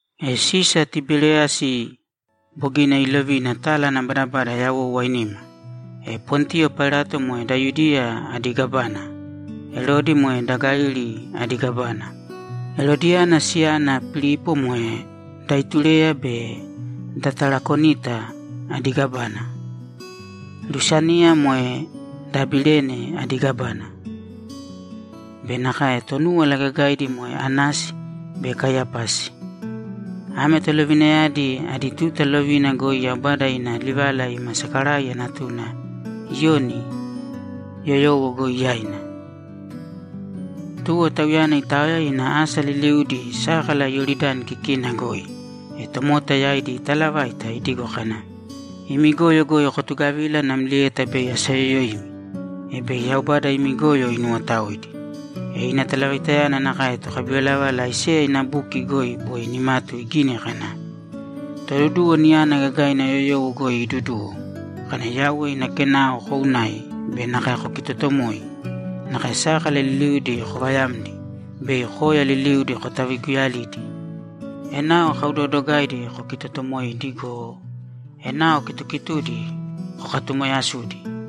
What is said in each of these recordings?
E Sisa Tiberiyasi bogina iilovina tala ana badabada yawou ainima, e Pontiyo Pailato moe da Yudiya adi gávana, Erodi moe da Galili adi gávana, Erodiyana siyana Pilipo moe da Itureya be da Tarakonita adi gávana, Lusaniya moe da Abilene adi gávana be nakae Tonúwala Gagaidi moe Anasi be Kaiyapasi. Ame tolovinayadi idi tuta lovina goi Yaubada ina livala ima Sakaraiya natuna Iyoni yoyowo goi yaina. Tuwo tauyana itaoya ina asa liliudi sákala Iyoridani kikina goi, e tomota yaidi itaalavaita idigo kana, ‘Imi goyo goi kotugavīla namlieta bei asayoyoimi, e bei Yaubada imi goyo inuwotaoidi.’ Ina talavaitayana nakae tokabivalavala Aiseya ina buki goi boi nimatu igini kana, ‘Toduduwo niyana gagaina yoyowo goi iiduduwo kana, “Yauwe ina kenao kounāi be nakae kokitotomōi! Nakae sákala liliudi kovayāmdi be koya liliudi kotaviguyalīdi! Enao kaudoodogaidi kokitotomoiīdi go, enao kitukitudi kokatumoyasūdi.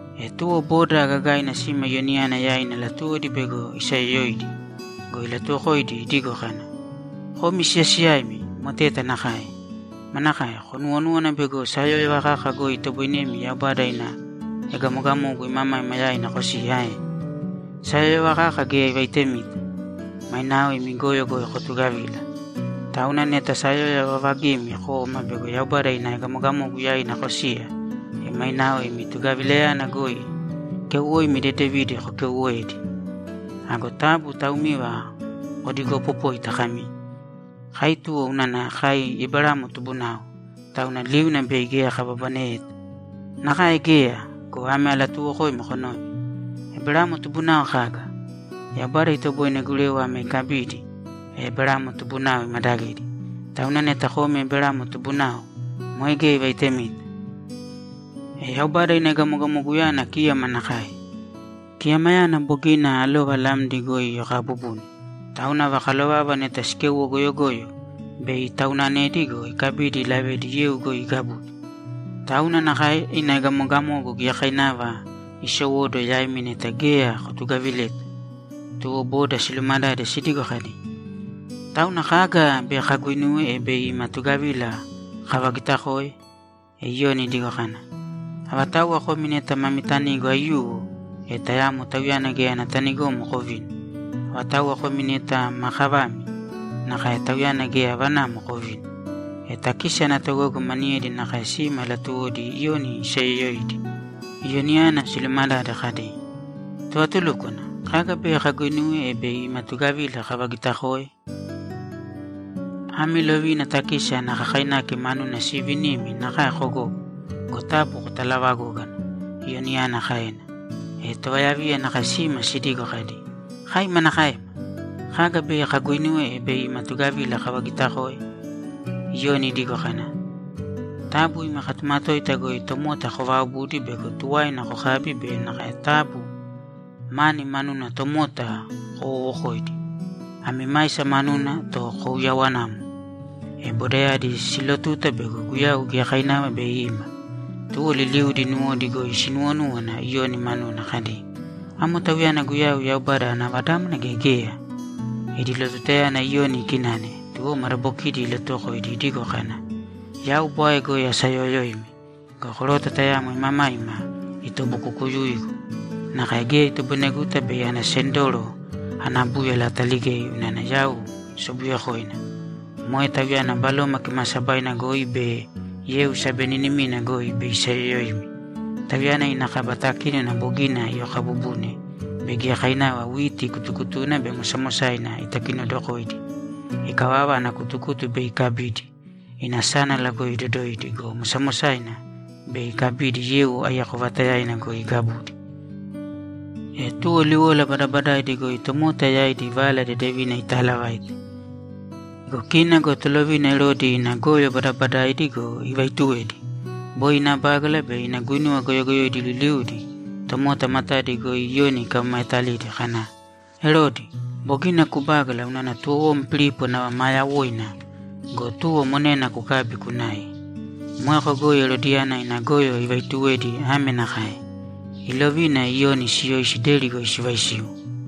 E tuwo boda gagaina sima Iyoniyana yaina latuwodi bego isayoyoidi go, ilatuuwokoidi idigo kana, ‘Komi siyasiyaimi moteta nakae! Manakae? Konuwonúwana bego sayóyova kaka goi itoboinemi Yaubada ina egamogamogu imamaima yaina kosiya ae? Sayóyova kaka geya ivaitemita! Mainao imi goyo goi kotugavīla. Tauna neta sayóyova vavagimi koma bego Yaubada ina egamogamoguyana yaina kosiya, e mainao imi tugavilayana goi keuwoimi dedevidi koguinuwēdi. Ago taabu taumiva kodigoopopōita kami, “Kai tuwo unana kai Eberamo tubunao, tauna liuna bei geya kababaneyeta.” Nakae geya go, ame alatuuwokoimi konōve: Eberamo tubunao kaga? Yaubada itoboine gurewa ame ikabidi, e Eberamo tubunao imadagidi. Tauna neta komi Eberamo tubunao, moe geya ivaitemita. E Yaubada ina egamogamoguyana kíyama nakae. Kiyamayana bogina alova lamdi goi iyokaabubune, tauna ava kalovava neta sikéuwo goyogoyo, bei itaunanedi go, ikabidi ilavedi yeu goi igabudi. Tauna nakae ina egamogamogu giyakainava isowóduwo yaimi neta geya kotugavileta.’ Tuwo boda siluumadade sidigo kadi, ‘Tauna kaga bei kaguinuwe, e bei ima tugavila kavagitakoe?’ E Iyoni idigo kana, ‘Avatauwa komi neta mami tanigo aiyuwo, e tayamo tauyana geya ana tanigomo kovīni. Avatauwa komi neta ma kavami, nakae; tauyana geya avanamo kovīni.’ E takisi ana togogo maniyedi nakae sima latuwodi Iyoni isayoyoidi. Iyoniyana silumadade kadi, ‘Tovatulúkwana, kaga bei kaguinuwe, e bei ima tugavila kavagitakoe?’ ‘Ami lovina takisi ana kakainaki manuna siivinimi nakae kogogo go, taabu kotalaavagōgana’, Iyoniyana kaena. E tovayaviya nakae sima sidigo kadi, ‘Kai manakaema? Kaga bei kaguinuwe, e bei ima tugavila kavagitakoe?’ Iyoni idigo kana, ‘Taabu imi katumatoita goi tomota kovaaobūdi bego tuwaina kokabi be nakae taabu mani manuna tomota kowoowokōidi. Ami maisa manuna to kouyawanāmo.’ E bodayadi siilotuta bego Guyau giyakainava bei ima. Tuwo liliudi nuwodi goi sinuwonúwana Iyoni manuna kadi, ‘Amo Tauyana Guyau, Yaubada ana Vadámana, gea geya?’ Idi lotutayana Iyoni ikinane, tuwo madabokidi ilatuwokoidi idigo kana, ‘Yau bwae goi asaayoyoimi. Go koroto tayamo imamaima itobukukuyuigu; nakae geya itoboineguta bei ana sendoro ana búyala ataligei unana yau sobuyekoina. Moe Tauyana Baloma Kimaasabaina goi be yeu sabeninimina goi bei isayoyoimi. Tauyana ina kaba takínona bogina iyokaabubune bei giyakainava witi kutukutuna be mosamosaina itakinodokoidi. Ikavava, ana kutukutu bei ikabidi, ina sánala goi idodoidi go, mosamosayana, bei ikabidi yeu aiyako vaatayaina goi igabudi.’ E tuwo liwola badabadaidi goi tomota yaidi Vala Dedevina itaalavaite. E kina go tolovina Erodi ina goyo badabadaidi go, ivaituwedi. Boi ina bágala be ina guinuwa goyogoyoidi liliudi tomota matadi goi Iyoni ikamamaetalidi kana, ‘Erodi, bogina kubágala unana tuwowom Pilipo nava maa yawoina go, tuwo monena kukabi kunai.’ Moeko goi Erodiyana ina goyo ivaituwedi ame nakae: Ilovina Iyoni siyoisi deri goi sivaisiu.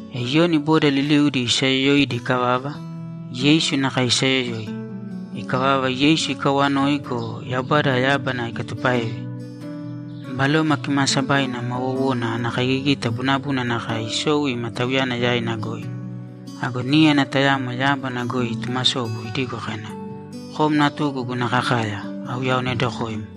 E Iyoni boda liliudi isaayoyoidi ikavava, Yeisu nakae isayoyoi. Ikavava, Yeisu ikawanoi go, Yaubada yábana ikatupáeve, Baloma Kimaasabaina ma wowona ana kaigigita bunabuna nakae isou ima Tauyana yaina goi. Ago níyana tayamo yábana goi itumasobu idigo kana, ‘Kom natugu guna kakaya, auyaonedokoim.’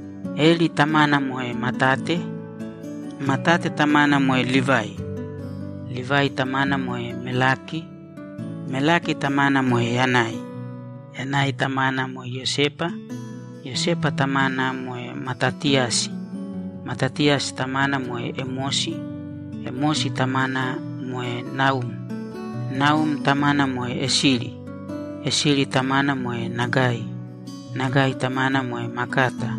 Eli tamana moe Matate. Matate tamana moe Livai. Livai tamana moe Melaki. Melaki tamana moe Yanai. Yanai tamana moe Iyosepa. Iyosepa tamana moe Matatiyasi. Matatiyasi tamana moe Emosi. Emosi tamana moe Naum. Naum tamana moe Esili. Esili tamana moe Nagai. Nagai tamana moe Makata.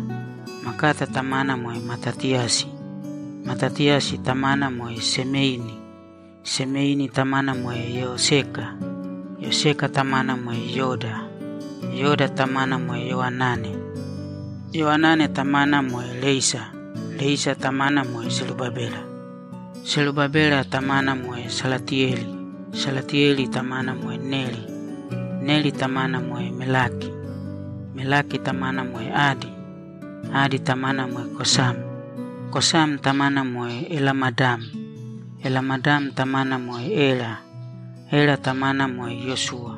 Makata tamana moe Matatiyasi. Matatiyasi tamana moe Semeini. Semeini tamana moe Yoseka. Yoseka tamana moe Yoda. Yoda tamana moe Yoanane. Yoanane tamana moe Reisa. Reisa tamana moe Serubabela. Serubabela tamana moe Salatiyeli. Salatiyeli tamana moe Neri. Neri tamana moe Melaki. Melaki tamana moe Adi. Adi tamana moe Kosam. Kosam tamana moe Elamadam. Elamadam tamana moe Era. Era tamana moe Iyosuwa.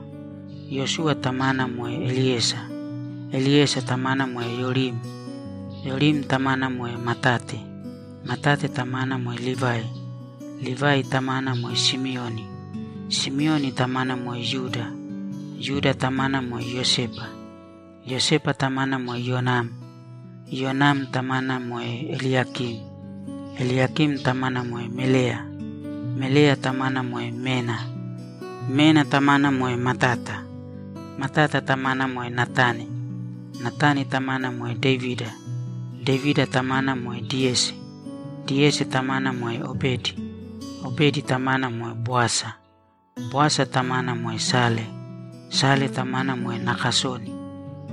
Iyosuwa tamana moe Eliyesa. Eliyesa tamana moe Yorim. Yorim tamana moe Matate. Matate tamana moe Livai. Livai tamana moe Simioni. Simioni tamana moe Yuda. Yuda tamana moe Iyosepa. Iyosepa tamana moe Iyonam. Iyonam tamana moe Eliyakim. Eliyakim tamana moe Meleya. Meleya tamana moe Mena. Mena tamana moe Matata. Matata tamana moe Natani. Natani tamana moe Devida. Devida tamana moe Diyesi. Diyesi tamana moe Obedi. Obedi tamana moe Boasa. Boasa tamana moe Sale. Sale tamana moe Nakasoni.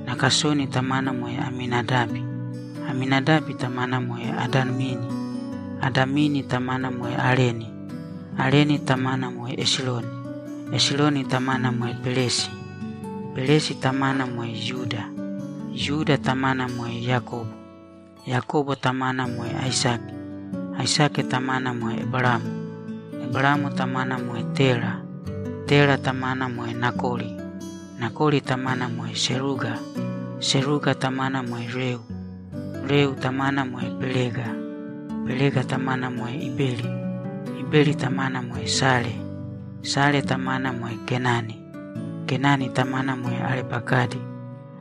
Nakasoni tamana moe Aminadabi. Aminadabi tamana moe Adamini. Adamini tamana moe Areni. Areni tamana moe Esironi. Esironi tamana moe Peresi. Peresi tamana moe Yuda. Yuda tamana moe Yakobo. Yakobo tamana moe Aisake. Aisake tamana moe Eberamo. Eberamo tamana moe Tera. Tera tamana moe Nakori. Nakori tamana moe Seruga. Seruga tamana moe Reu. Reu tamana moe Pelega. Pelega tamana moe Iberi. Iberi tamana moe Sale. Sale tamana moe Kenani. Kenani tamana moe Arepakadi.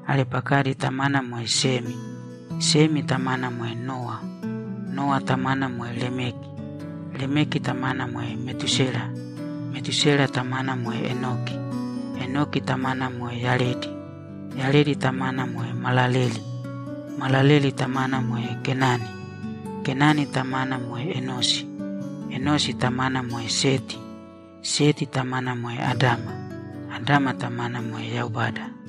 Arepakadi tamana moe Semi. Semi tamana moe Nowa. Nowa tamana moe Lemeki. Lemeki tamana moe Metúsela. Metúsela tamana moe Enoki. Enoki tamana moe Yaredi. Yaredi tamana moe Malaleli. Malaleli tamana moe Kenani. Kenani tamana moe Enosi. Enosi tamana moe Seti. Seti tamana moe Adama. Adama tamana moe Yaubada.